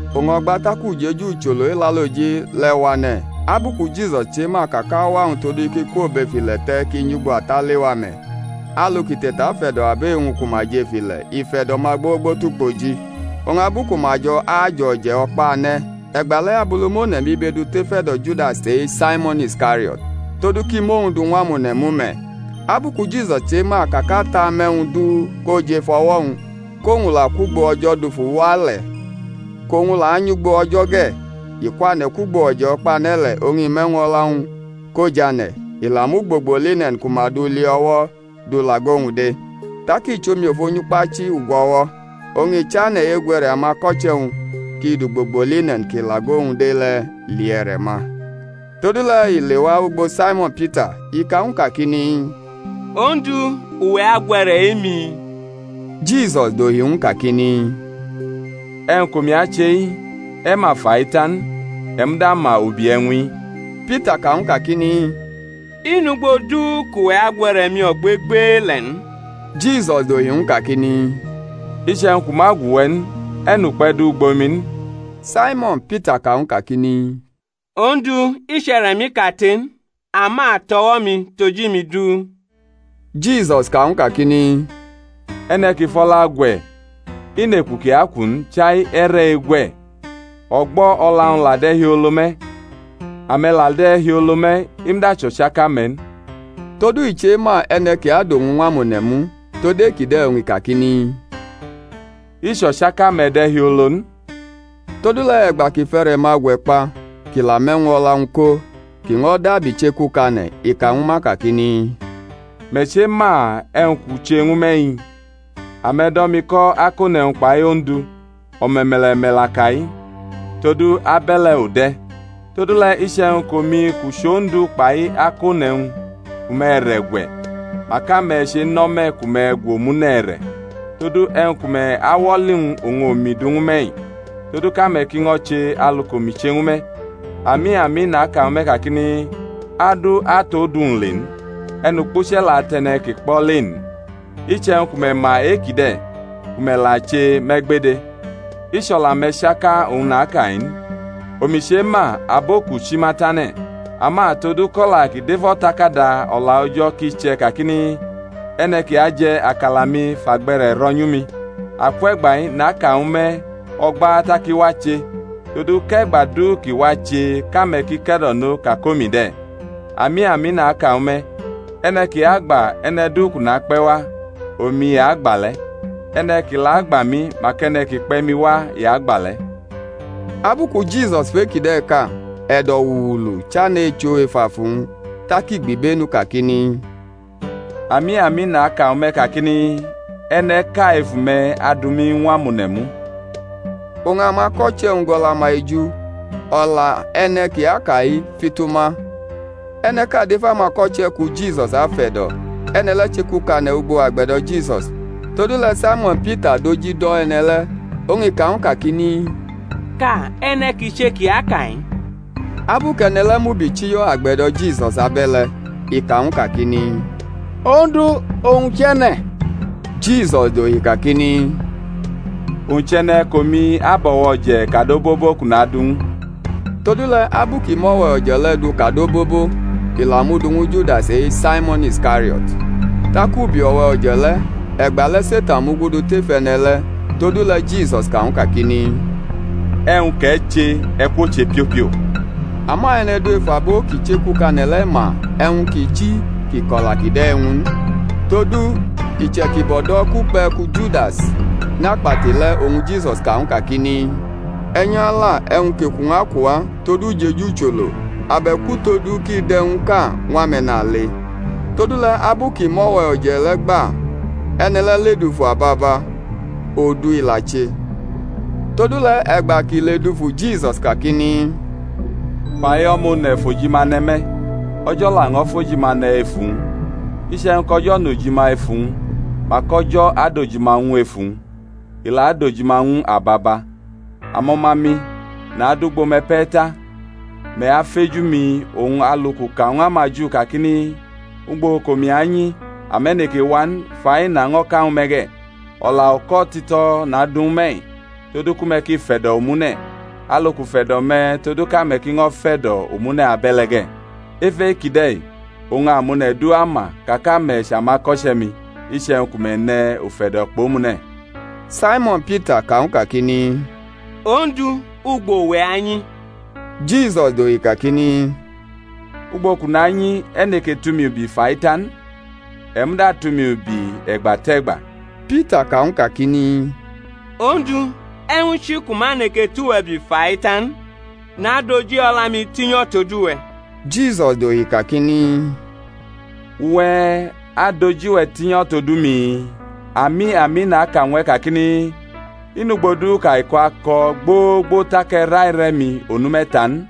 Oñ o̩gba tak ujeju ucholo Elaloji le̩ wane̩, abu ku Jisus chema ka kʼauwa-wñ todu kʼi kwo bʼef ile̩ te̩ kʼi nyʼugbo Ata lewa me̩; alu kʼi te̩tafe̩do̩ abo e-wñ ku ma jʼef ile̩, i fe̩do̩ ma gbogbo tʼukpoji. Oñ abu ku ma jo̩ ajʼo̩je̩ o̩kpane̩, e̩gba le̩ Abulumone̩ mʼibe du tʼef e̩do̩ Judas e-Saimo̩n Iskario̩t todu kʼi mʼowñ du ñw amone̩ mu me̩, abu ku Jisus chema ka kʼAta mʼe̩wñ du ko jʼef o̩wo̩-wñ, kʼowñ la kwʼugbo O̩jo̩ dufu wa le̩, kʼowñ la anyʼugbo O̩jo̩ ge̩,— i kwane̩ kwʼugbo o̩je̩ o̩kpane̩ le̩, oñ i mʼe̩wñ o̩la-wñ ko lane̩: i la mʼugbogbo line̩n ku ma du li o̩wo̩ du lʼago-wñ de. Tak i chʼomiofo nyʼukpachi-ugwo̩wo̩, oñ i chane̩ egwʼe̩re̩ amako̩che̩-wñ kʼi dʼugbogbo line̩n ki lʼago-wñ de le̩ li e̩re̩-ma. Todule̩ i lewa ugbo Saimo̩n Pita, i ka ñw u kakini, Ondu, uwe̩ agwʼe̩re̩ e-mi? Jisus dohi ñw u kakini, E̩wñ kʼomi ache-i, e̩ ma fa-i ta n, e̩ muda ama ubi e̩wñ-i. Pita ka ñw u kakini, I nʼugbo du kʼuwe̩ agwʼe̩re̩-mi ogbegbele̩ n. Jisus dohi ñw u kakini, Iche̩wñ kʼu ma gwʼuwe̩ n, e̩ nʼukpe̩ du ugbo mi n. Saimo̩n Pita ka ñw u kakini, Ondu, i chʼe̩re̩-mi kate n, ama tʼo̩wo̩-mi tʼoji-mi du. Jisus ka ñw u kakini, E̩ne̩ ki fʼo̩la gwe̩ i nʼeku kʼi aku n chai e̩re̩ egwe̩, o̩gbo̩ o̩la-wñ la de̩ hiolo me̩; ame̩ la de̩ hiolo me̩, i muda chʼo̩chaka-me̩ n. Todu i chema e̩ne̩ ki adʼowñ ñw amone̩ mu, tod e-kide̩ oñ i kakini, I chʼo̩chaka-me̩ de̩ hiolo n. Todule̩ e̩gba kʼi fʼe̩re̩-ma gwe̩ kpa kʼi la mʼe̩wñ o̩la-wñ ko, kʼi ño̩ dabi chekukane̩, i ka ñwu ma kakini, Me̩ chema e̩wñ kʼu che ñwu me̩-i? Ame̩ do̩ mi ko̩ Akone̩wñ kpai Ondu, o̩me̩me̩le̩ me̩ la ka-i, todu abe̩le̩ u de̩. Todule̩ iche̩wñ kʼomi kʼu chʼOndu kpai Akone̩wñ fʼume̩ e̩re̩ gwe̩, mak ame̩ chenʼo̩me̩ ku me̩ gwʼomune̩ e̩re̩. Todu e̩wñ ku me̩ awʼo̩li-wñ oñ omi du ñwu me̩-i, todu kʼame̩ ki ño̩ che alu kʼomi che ñwu me̩. Ami, ami, naka ñwu me̩ kakini, Adu atʼodu-wñ le n, e̩nukpuche̩ la tʼe̩ne̩ ki kpʼo̩ le n. Iche̩wñ ku me̩ ma e-kide̩, ku me̩ la che, me̩ gbede. I chʼo̩la-me̩ chaka oñ naka-i n. Omi chema abo kʼu chi ma tane̩; ama todu kʼo̩la ki dʼef O̩takada O̩la O̩jo̩ ki che̩ kakini, E̩ne̩ ki aje̩ akala-mi fʼagbe̩re̩ ro̩ nyu mi. Akwe̩gba-i naka ñwu me̩ o̩gba tak i wache, todu kʼe̩gba du kʼi wache kʼame̩ ki ke̩do̩no ka kʼomi de̩. Ami, ami, naka ñwu me̩, e̩ne̩ ki agba e̩ne̩ du kʼu nakpe̩ wa, omi i agba le̩; e̩ne̩ ki la agba mi mak e̩ne̩ ki kpe̩ mi wa i agba le̩. Abu ku Jisus fʼe-kide̩ ka, e̩do̩-wuulu chane̩ echʼo ef afu-wñ, tak i gbibenu kakini, Ami, ami, naka ñwu me̩ kakini, E̩ne̩ʼka efu me̩ adu mi ñw amone̩ mu. Oñ amako̩che̩-wñ gʼo̩la-ma eju, o̩la e̩ne̩ kʼi aka-i fitu ma. E̩ne̩ʼka dʼef amako̩che̩-wñ ku Jisus afe̩do̩, e̩ne̩ le̩ chekukane̩ ugbo agbe̩do̩ Jisus. Todule̩ Saimo̩n Pita dʼoji do̩ e̩ne̩ le̩, oñ i ka ñw u kakini, Ka e̩ne̩ ki che kʼi aka-i. Abu kʼe̩ne̩ le̩ mubichiyo̩ agbe̩do̩ Jisus abe̩le̩, i ka ñw u kakini, Ondu, owñ chʼe̩ne̩? Jisus dohi kakini, Owñ chʼe̩ne̩ kʼomi abʼo̩we̩ o̩je̩ kad obobo kʼu nadʼu ñw u. Todule̩ abu kʼi mʼo̩we̩ o̩je̩ le̩ du kad obobo, i la mʼu du ñwu Judas e-Saimo̩n Iskario̩t. Tak ubi o̩we̩ o̩je̩ le̩, e̩gba le̩ Setan mugudu tef e̩ne̩ le̩. Todule̩ Jisus ka ñw u kakini, E̩wñ kʼe̩ che, e̩ kwoche piopio. Ama e̩ne̩ du ef abo ki chekukane̩ le̩ ma e̩wñ ki chi kʼi ko̩la kide̩ ñw u n. Todu iche̩kibo̩ do̩ kʼukpe̩ ku Judas nʼakpati le̩ oñ Jisus ka ñw u kakini, E̩ nyʼala e̩wñ kʼeku-wñ aku uwa tod ujeju ucholo; abe̩k utodu kʼi dʼe̩wñʼka ñw ame̩nale. Todule̩ abu kʼi mʼo̩we̩ o̩je̩ le̩ gba e̩ne̩ le̩ ledufu ababa; odu i la che. Todule̩ e̩gba kʼi ledufu Jisus kakini, Fa-i O̩ma One̩ fojima ne̩ me̩, O̩jo̩ laño̩ fʼojima ne̩ ef uwñ. Iche̩wñ kʼO̩jo̩ nʼojima ef uwñ, mak O̩jo̩ adʼojima ñw u ef uwñ. I la adʼojima ñw u ababa. Amo̩ma-mi, nadʼugbo-me̩ pe̩ ta. Me̩ afeju mi, oñ alu kʼu ka ñw amaJu kakini, Ugbo kʼomi anyi, ame̩ neke wa n, fa-i naño̩ ka ñwu me̩ ge̩. O̩la uko̩ tito̩ nadu ñwu me̩-i, todu ku me̩ ki fe̩do̩ omune̩; alu kʼu fe̩do̩ me̩ todu kʼame̩ ki ño̩ fe̩do̩ omune̩ abe̩le̩ ge̩. Ef e-kide̩ oñ amone̩ du ama ka kʼame̩ chʼamako̩che̩-mi, iche̩wñ ku me̩ ne̩ ufe̩do̩ kpʼomune̩. Saimo̩n Pita ka ñw u kakini, Ondu, ugbo uwe̩ anyi? Jisus dohi kakini, Ugbo kʼu nanyi e̩ neke tʼumi ubi fa-i ta n; e̩ muda atʼumi ubi e̩gba tʼe̩gba. Pita ka ñw u kakini, Ondu, e̩wñ chi kʼu ma neke tʼuwe̩ ubi fa-i ta n? nadʼoji o̩la-mi tinyo̩ tod uwe̩. Jisus dohi kakini, Uwe̩ adʼoji-we̩ tinyo̩ tod umi? Ami, ami, naka ñw e̩ kakini, I nʼugbo du kʼaiko̩ ako̩ gbogbo tak e̩ raire̩ mi onu me̩ta n.